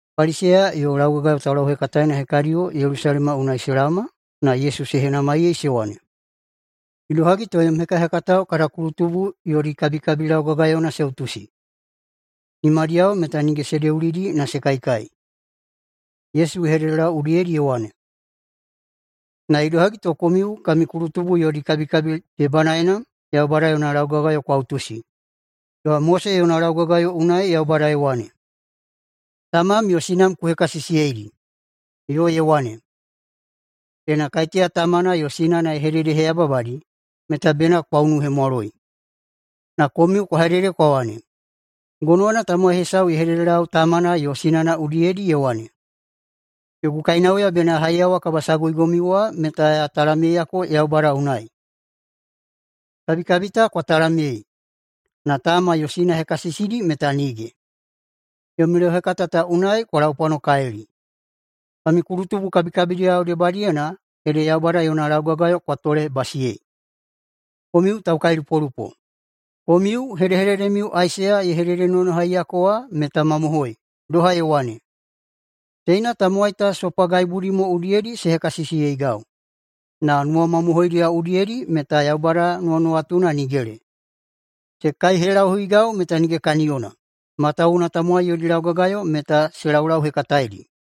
Paliseya yo laugagayo taulauhekataena hekadiyo Yelusalema unai se laoma na Yesu se henamaiyei se wane, “Idohagi to yom hekahekatao kada kulutubu yodi kabikabi laugagayona se utusi? Nimadiyao meta nige se deulidi na se kaikai.” Yesu ye hededelau udiyedi ye wane, “Na idohagi to komiu kami kulutubu yodi kabikabi debanaena Yaubada yona laugagayo kwa utusi? Doha Mose yona laugagayo unai Yaubada ye wane, ‘Tamam yo sinam ku hekasisiyeidi.’ Yo ye wane, ‘Ena kaiteya tamana yo sinana ye hededeheyababadi meta bena kwa unuhemwaloi.’ Na komiu kwa hedede kwa wane, ‘Gonowana tamowai hesau ye hededelau tamana yo sinana udiyedi ye wane, “Yogu kainauya bena ya haiyawa kabasaguigomiu wa meta ya talamyeiyako Yaubada unai.” ’ Kabikabi ta kwa talamyei, na tama yo sina hekasisidi meta nige! Yomi lauhekata ta unai kwa laupwanokalili. Kami kulutubu kabikabidiyao debadiyena ede Yaubada yona laugagayo wa kwa tolebasiyeidi. Komiu taukailupolupo! Komiu hedehededemiu Aisaiya ye hededenonohaiyako wa meta mamohoi, doha ye wane, ‘Teina tamowai ta sopagaibudi mo udiyedi se hekasisiyeigau na nuwamamohoidiyao udiyedi meta Yaubada nuwanuwatuna nigele. Se kaihelahuigau meta nige kaniyona, matawuwuna tamowai yodi laugagayo meta se laulauhekataeidi.’”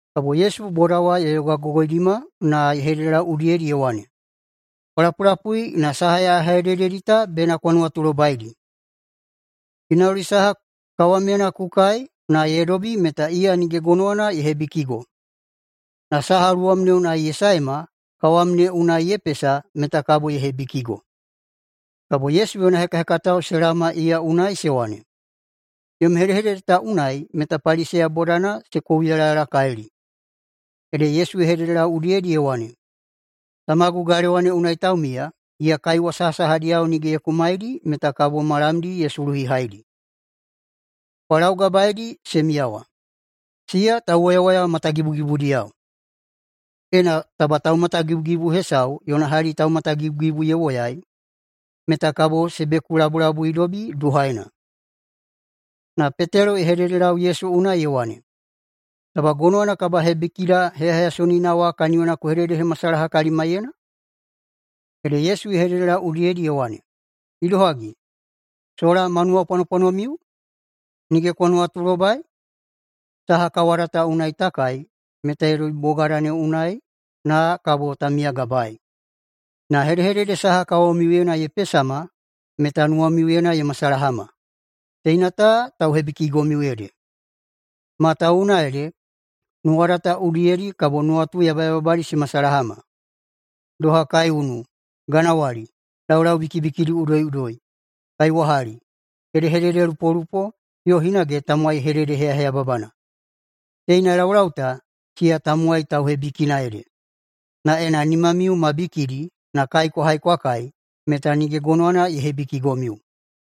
Kabo Yesu boda wa ye yogagogoidima na ye hededelau udiyedi ye wane, “Kwa lapulapui na saha ya hedededi ta bena kwa nuwatulobaidi. Ginauli saha kawamyena ku kai na ye dobi meta iya nige gonowana ye hebikigo, na saha luwam ne unai ye saema kawam ne unai ye pesa meta kabo ye hebikigo.” Kabo Yesu yona hekahekatao se laoma iya unai se wane, “Yom hedehedede ta unai meta Paliseya bodadi se kouyalayalakalili.” Ede Yesu ye hededelau udiyedi ye wane, “Tamagu galewa ne unai taumiya, iya kaiwa sahasahadiyao nige ye kumaidi meta kabo ma lamdi ye suluhihaidi. Kwa laugabaeidi se miyawa, siya tauwoyawoya matagibugibudiyao. Ena taba taumatagibugibu hesau yona hali taumatagibugibu ye woyai, meta kabo se bekulabulabuidobi duhaena.” Na Petelo ye hededelau Yesu unai ye wane, “Taba gonowana kabahebikida heyaheyasonina wa kaniyona ku hededehemasalaha kalimaiyena?” Ede Yesu ye hededelau udiyedi ye wane, “Idohagi, sola ma nuwapwanopwanomiu? Nige kwa nuwatulobai? Saha kawada ta unai ta kai meta ye dobi bogada ne unai na kabo ta miyagabaei. Na hedehedede saha kawamiuyena se pesama meta nuwamiuyena se masalahama, teina ta tauhebikigomiu ede. Matawuwuna ede nuwada ta udiyedi kabo nuwatu yabayababadi se masalahama, doha kaiunu, ganawali, laulau bikibikidi udoiꞌudoi, kaiwahali, hedehededelupolupo, yo hinage tamowai hededeheyaheyababana. Teina laulau ta, siya tamowai tauhebikina ede. Na ena nimamiu ma bikidi na kai kwa hai kwa kai meta nige gonowana ye hebikigomiu.”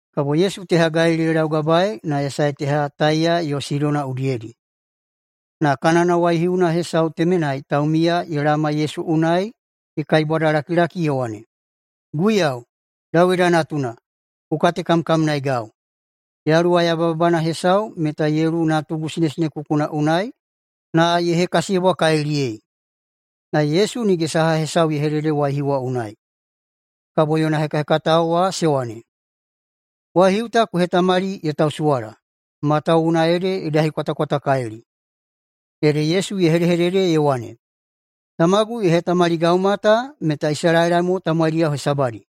Kabo Yesu teha Galili ye laugabaei na ye sae teha Taiya yo Sidona udiyedi. Na Kanana waihiuna hesau temenai taumiya ye laoma Yesu unai ye kaibwadalakilaki ye wane, “Guiyau, Dawida natuna, ku katekamkamnaegau! Yaluwa yababana hesau meta ye luwu natugu sinesinekukuna unai na ye hekasiyebwakaliliyei.” Na Yesu nige saha hesau ye hedede waihiu wa unai. Kabo yona hekahekatao wa se wane, “Waihiu ta ku hetamali ye tausuwala, matawuwuna ede ye dahikwatakwatakalili.” Ede Yesu ye hedehedede ye wane, “Tamagu ye hetamaligauma ta meta Isalaela mo tamowaidi hesabadi,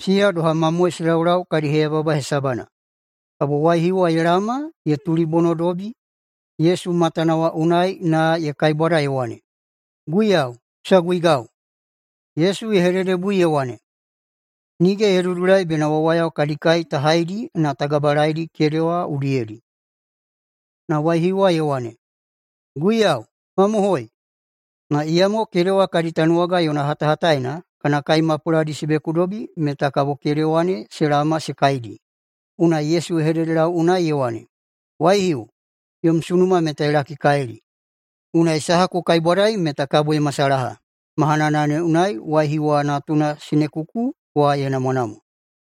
siya doha mamoe se laulau kadi heyababa hesabana.” Kabo waihiu wa ye laoma ye tulibonodobi Yesu matana wa unai na ye kaibwada ye wane, “Guiyau, ku saguigau!” Yesu ye hededebui ye wane, “Nige ye dudulai bena wawayao kadi kai ta haidi na ta gabalaedi kedewa udiyedi.” Na waihiu wa ye wane, “Guiyau, mamohoi, na iyamo kedewa kadi tanuwaga yona hatahataena kana kai mapuladi se bekudobi meta kabo kedewa ne se laoma se kaidi.” Unai Yesu ye hededelau unai ye wane, “Waihiu, yom sunuma meta ye lakikalili! Unai saha ku kaibwadai meta kabo ye masalaha.” Mahanana ne unai waihiu wa natuna sinekuku wa ye namwanamwa.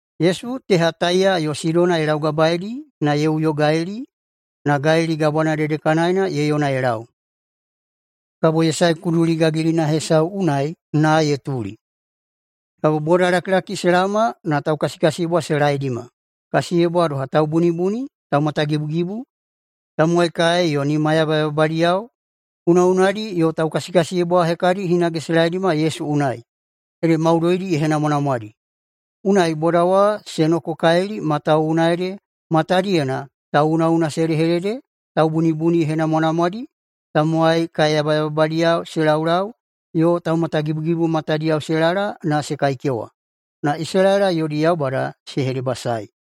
Yesu teha Taiya yo Sidona ye laugabaeidi na ye uyo Galili, na Galili Gabwana dedekanaena ye yona ye lau. Kabo ye sae kuduli gagilina hesau unai na ye tuli. Kabo bodalakilaki se laoma na taukasikasiyebwa se laeidima, kasiyebwa doha taubunibuni, taumatagibugibu, tamowai kae yo nima yabayababadiyao, unaꞌunadi yo taukasikasiyebwa hekadi hinage se laeidima Yesu unai, ede maudoidi ye henamwanamwadi. Unai boda wa se nokokalili, matawuwuna ede matadiyena tauꞌunaꞌuna se hedehedede, taubunibuni ye henamwanamwadi, tamowai kae yabayababadiyao se laulau yo taumatagibugibu matadiyao se lala na se kaikewa. Na Isalaela yodi Yaubada se hedebasaei.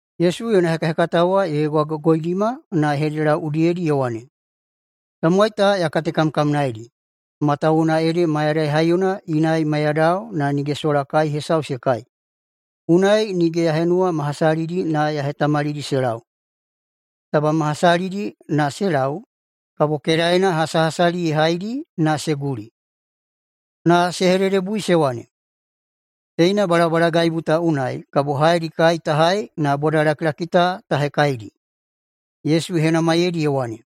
Yesu yona hekahekatao wa ye yogagogoidima na ye hededelau udiyedi ye wane, “Tamowai ta ya katekamkamnaedi, matawuwuna ede mayadai haiyona inai maiyadao na nige sola kai hesau se kai, unai nige ya henuwa ma hasalidi na ya hetamalidi se lau. Taba ma hasalidi na se lau kabo kedaena hasahasali ye haidi na se guli.” Na se hededebui se wane, “Teina balabalagaibu ta unai kabo haedi kai ta hai na bodalakilaki ta ta hekaidi?” Yesu ye henamaiyeidi ye wane,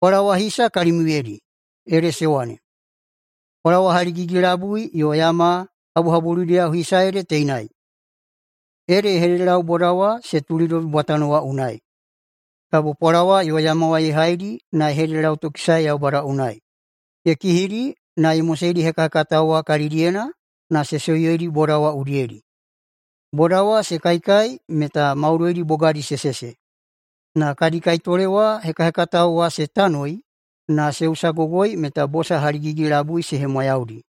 “Pwalawa hisa kalimiuyedi?” Ede se wane, “Pwalawa haligigi-labui yo yama habuhabuludiyao hisa ede teinai.” Ede ye hededelau boda wa se tulidobi bwatano wa unai. Kabo pwalawa yo yama wa ye haidi na ye hededelautokisae Yaubada unai, ye kihidi na ye moseidi hekahekatao wa kalidiyena, na se soiyedi boda wa udiyedi. Boda wa se kaikai meta maudoidi bogadi se sese. Na kadi kaitole wa hekahekatao wa se tanoi na se usagogoi meta bosa haligigi-labui se hemwayaudi.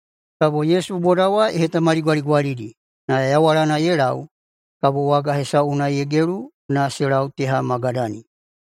Kabo Yesu boda wa ye hetamaligwaligwalidi. Na yawalana ye lau kabo waga hesau unai ye gelu na se lau teha Magadani.